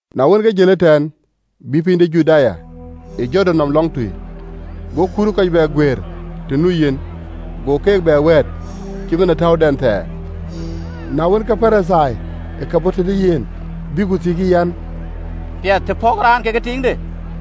Na wën, ke jël ëtɛ̈ɛ̈n, bï piny de Juda ë Jordan nɔm lɔŋtui. Go kuut ke kɔc bɛ guëër të nu yen, go keek bɛ wɛ̈ɛ̈t, cït man ë täudɛn thɛɛr. Na wën, ke Parithai ë ke bɔ̈ tëde yen, bïk ku thiëckï, them kek en an, “Piɛth të pɔ̈kë raan kekë tiiŋde?”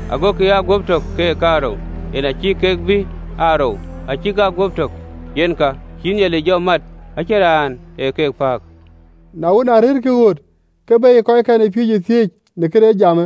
agokï aa guöp tök keek kaarou: yen a cïï kek be aa rou, acïk aa guöp tök. Yen ka cïï Nhialic jɔ mat, ë cïn raan ë ke pääk.” Na wën, arëërkï ɣööt, ke beyë kɔckɛn ë piööcë thiëëc në këde jamë.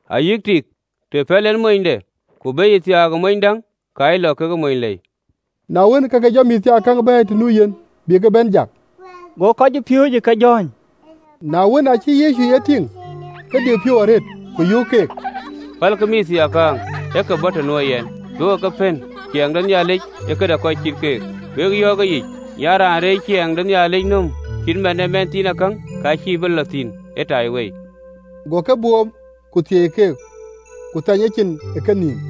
Ayï tik, të pɛ̈l en monyde, ku beyë thiaak ë mony däŋ, ka ye lɔ ke mony lei.” Na wën, ke ke jɔ mïththiaakäŋ bɛ̈ɛ̈i të nu yen, bï ke bɛ̈n jak: go kɔcpiööcë ke jɔ̈ɔ̈ny: na wën, aacï Yecu ye tïŋ, ke diu piɔ̈u arëët, ku yöök keek, pälkï mïththiaakäŋ ë ke bɔ̈ të nuö yɛn, duökï ke pën: ciɛɛŋ de Nhialic ee këde kɔc cït keek. Wek yɔ̈ɔ̈k ëyic an, Raan reec ciɛɛŋ de Nhialic nööm cït man ë mɛnhthiinakäŋ, ka cïï bï lɔ thïn ëtaiwei.” Go ke boom, ku thieei keek, ku thɛny ecin ë kenïïm.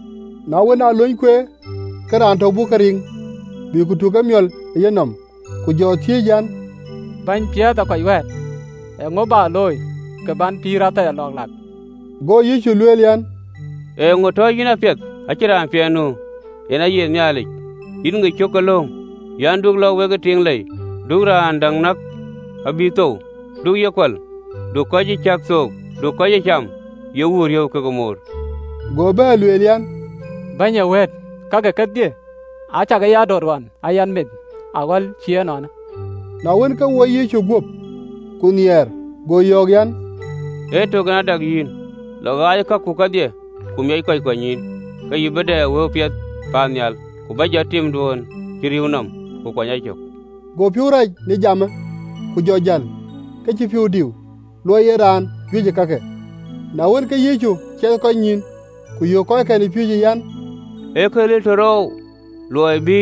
Na wën, alööny kueer, ke raan tök bɔ̈ ke riŋ, bï ku tuk emiɔl ë yenɔm, ku jɔ thiëëc an, “Bɛ̈ny piɛth ee kɔc wɛ̈ɛ̈t, eeŋö bä looi kë bän pïïr athɛɛr lɔ̈ɔ̈k lak?” Go Yecu lueel an, “Eeŋö tɔ yïn ɛn ee raan piɛth? Acïn raan piɛth nu, ee Nhialic Yetök. Yïn ŋic cök ke lööŋ an, ‘Du lɔ wekë tiiŋ lei, du raan däŋ näk abï thou, du ye kual, du kɔc ee cäk thook, du kɔc ee cam, ye wuur riëëu kekë moor.”’ Go bɛ̈ɛ̈r an, “Bɛ̈ny ee wëët, kake kedhie acä ke ya döt ɣɔn aa yɛn meth aɣɔ̈l cï ënɔɔnë.” Na wën, ke woi Yecu guöp, ku nhiɛɛr, go yɔ̈ɔ̈k an, “Ee tök en a dak yïn: lɔ, ɣaacë kaku kedhie, ku miɔc kɔc kuanynyïïn, ke yïn bï dɛ wëu piɛth paannhial: ku bä, jɔt timduön cï rïïu nɔm, ku kuany a cök.” Go piɔ̈u rac në jamë, ku jɔ jäl, ke cï piɔ̈u diu, luɔi ee yen raan juëc ë kake. Na wën, ke Yecu ciɛɛth kɔc nyïïn, ku yöök kɔckɛn ë piööcë an, “Ee këril ëtör oou, luɔi bï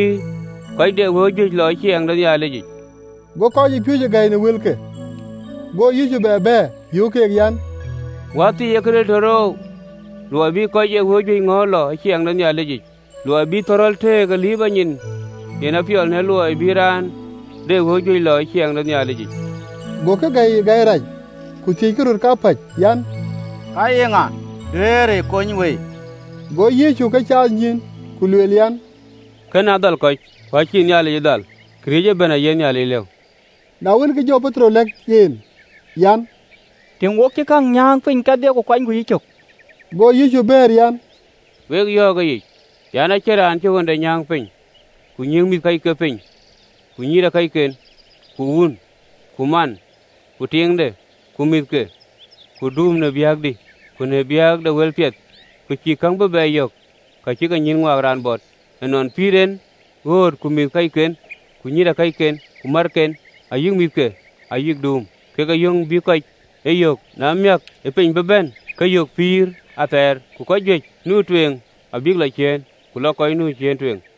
kɔc de wëu juëc lɔ ë ciɛɛŋ de Nhialic yic!” Go kɔcpiööcë gäi në wëlke. Go Yecu bɛ bɛ̈ɛ̈r, yöök keek an, “Wäthii, ee këril ëtör oou, luɔi bï kɔc ee wëu juëc ŋɔ̈ɔ̈th lɔ ë ciɛɛŋ de Nhialic yic! Luɔi bï thɔ̈rɔ̈l tëëk ë liiprɔ nyin, yen apiɔl në luɔi bï raan de wëu juëc lɔ ë ciɛɛŋ de Nhialic yic.” Gokï gäi ë gäi rac, ku thiëckï röt kapäc an, “Ka ye ŋa duëërë kony wëi?” Go Yecu ke caath nyïïn, ku lueel an, “Kënë adhal kɔc, ku acïï Nhialic dhal: këriëëc ëbɛ̈n aye Nhialic lëu.” Na wën, ke jɔ Petero lɛ̈k en an, “Tïŋ, wo cï käŋ nyääŋ piny kedhie, ku kuanyku yïcök.” Go Yecu bɛ̈ɛ̈r an, “Wek yɔ̈ɔ̈k ëyic, an, Acïn raan cï ɣönde nyääŋ piny, ku nyiëëŋ mïthëkɔcken piny, ku nyïïrëkɔcken, ku wun, ku man, ku tiiŋde, ku mïthke, ku duum, në biäkdï, ku në biäk de wëlpiɛth, ku cïï käŋ bï bɛ yök, ka cï kenyïïn ŋuak raan bɔt ë nɔn pïïr en, ɣööt, ku mïthëkɔcken, ku nyïïrëkɔcken, ku märken, ayï mïthke, ayï duum, kekë yöŋ bï kɔc e yɔŋ, na miäk ë piny bï bɛ̈n, ke yök pïïr athɛɛr. Ku kɔc juëc nu tueŋ abïk lɔ ciëën, ku lɔ kɔc nu ciëën tueŋ.”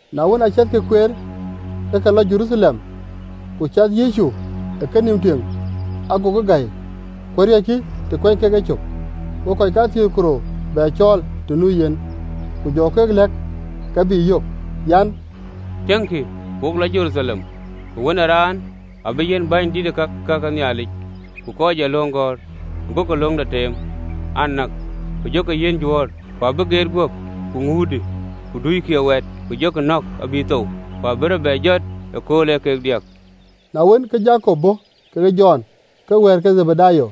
Na wën, aciɛthkï kueer, ke ke lɔ Jeruthalem, ku cath Yecu ë kenïïm tueŋ, agokï gäi, ku ariɔ̈ckï të kuɛny kek e cök. Go kɔc kathiëër ku rou bɛ cɔɔl të nu yen, ku jɔ keek lɛ̈k ka bï yök. Go lueel an, “Tiëŋkï, wo lɔ Jeruthalem, ku Wën ë Raan abï yiɛ̈n bänydït ke ka ke Nhialic ku kɔc ee löŋ gɔ̈ɔ̈r, agokï löŋde teem an, näk, ku jɔkï yiɛ̈n Juöör: ku abïk geet guöp, ku ŋuutkï, ku duikï ë waat, ku jɔkï nɔ̈k abï thou, ku abï rɔt bɛ jɔt ëkööl ee kek diäk.” Na wën, ke Jakop bɔ̈ kekë Jɔn, kek wɛ̈ɛ̈t ke Dhebedayo,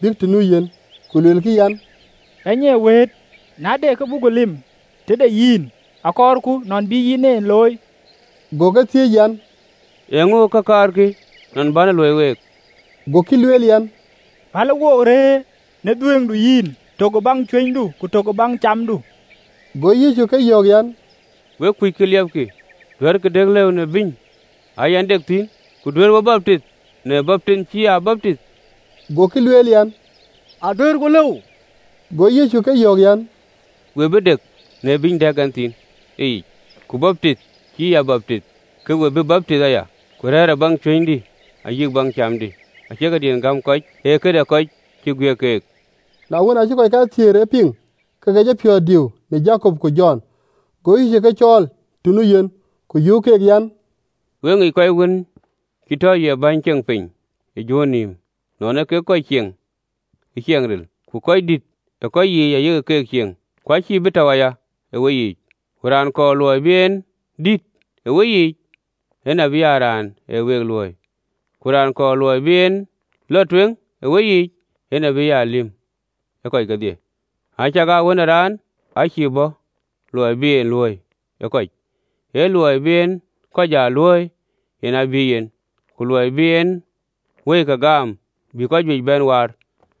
bïk të nu yen, ku luelkï an, “Bɛ̈ny ee wëët, na de kë buk lip tëde yïn, akɔɔrku nɔn bï yïn e looi.” Go ke thiëëc an, “Ee käŋö kë kaarkï nɔn bän e luöi week?” Gokï lueel an, “Pälë wo rëër në dhuëëŋdu yic, tök ë baŋ cuënydu, ku tök ë baŋ camdu.” Go Yecu ke yɔ̈ɔ̈k an, “Wek kuc kë liɛpkï. Duɛ̈ɛ̈rkï dek në bïny aa yɛn dek thïn, ku duëërë we baptith në baptinh bï ya baptith?” Gokï lueel an, “Aduëërku lëu.” Go Yecu ke yɔ̈ɔ̈k an, “We bï dek në bïny dɛ̈k ɛn thïn ë yic, ku baptith bï ya baptith, ke we bï baptith aya: ku rëër ë baŋ cuënydï ayï baŋ camdï acie këdiën gäm kɔc: ee këde kɔc cï ë guiëk keek.” Na wën, acï kɔc kathiëër ye piŋ, ke ke jɔ piɔ̈ɔ̈th diu në Jakop ku Jɔn. Go Yecu ke cɔ̈ɔ̈l të nu yen, ku yöök keek an, “We ŋic kɔc wën cï tɔ ye bäny ceŋ piny ë juöör nïïm, nɔn ee kek kɔc cieŋ ë ciɛɛŋ ril, ku röördït ë keyiic aye keek cieŋ. Ku acïï bï tɔ̈u aya ë weyiic: ku raan kɔɔr luɔi bï en dït ë weyiic, en abï aa raan ë week luööi: ku raan kɔɔr luɔi bï en lɔ tueŋ ë weyiic, en abï aa lïm ë kɔc kedhie. Acakaa Wën ë Raan aa cïï bɔ̈ luɔi bï ye luööi ë kɔc, ee luɔi bï en kɔc aa luööi, yen aa bï yen, ku luɔi bï en wëike gam bï kɔc juëc bɛ̈n waar.”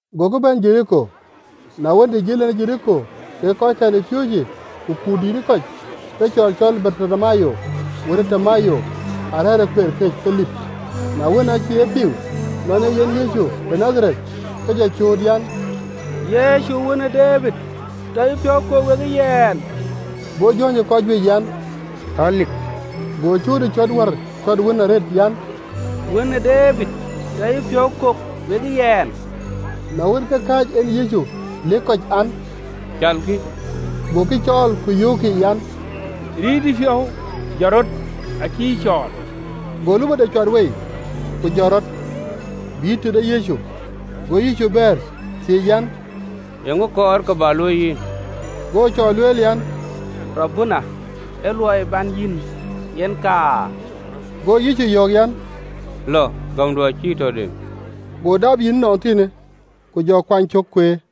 Gokï bɛ̈n Jeriko: na wën, të jël en Jeriko kekë kɔckɛn ë piööcë ku kut dïït ë kɔc, ke cɔɔr cɔl Bartimayo, wën ë Timayo, arɛ̈ɛ̈r ë kueer këc, ke lip. Na wën, aacï ye piŋ nɔn ee yen Yecu de Nadhareth, ke jɔ cööt an, “Yecu, wën ë Debid, tɔ yïpiɔ̈u kok wekë yɛn.” Go jɔ̈ɔ̈ny ë kɔc juëc, an, “Le lik, go cööt ë cɔ̈t wär cɔ̈t wën arëët, an, “Wën ë Debid, tɔ yïpiɔ̈u kok wekë yɛn.” Na wën, ke kääc en Yecu, ku lëk kɔc an, “Calkï.” Gokï cɔɔl, ku yöökkï an, “Rit yïpiɔ̈u, jɔt rɔt, acï yï cɔɔl.” Go lupɔde cuat wei, ku jɔt rɔt, bïï tëde Yecu. Go Yecu bɛ̈ɛ̈r, thiëëc an, “Eeŋö kɔɔr kë bä luöi yïn?” Go cɔɔr lueel an, “Raboni, ee luɔi bän yïn, yen akaar.” Go Yecu yɔ̈ɔ̈k an, “Lɔ, gämdu acï yï tɔ dem.” Go dap yïn ënɔnthiinë, ku jɔ kuany cök kueer.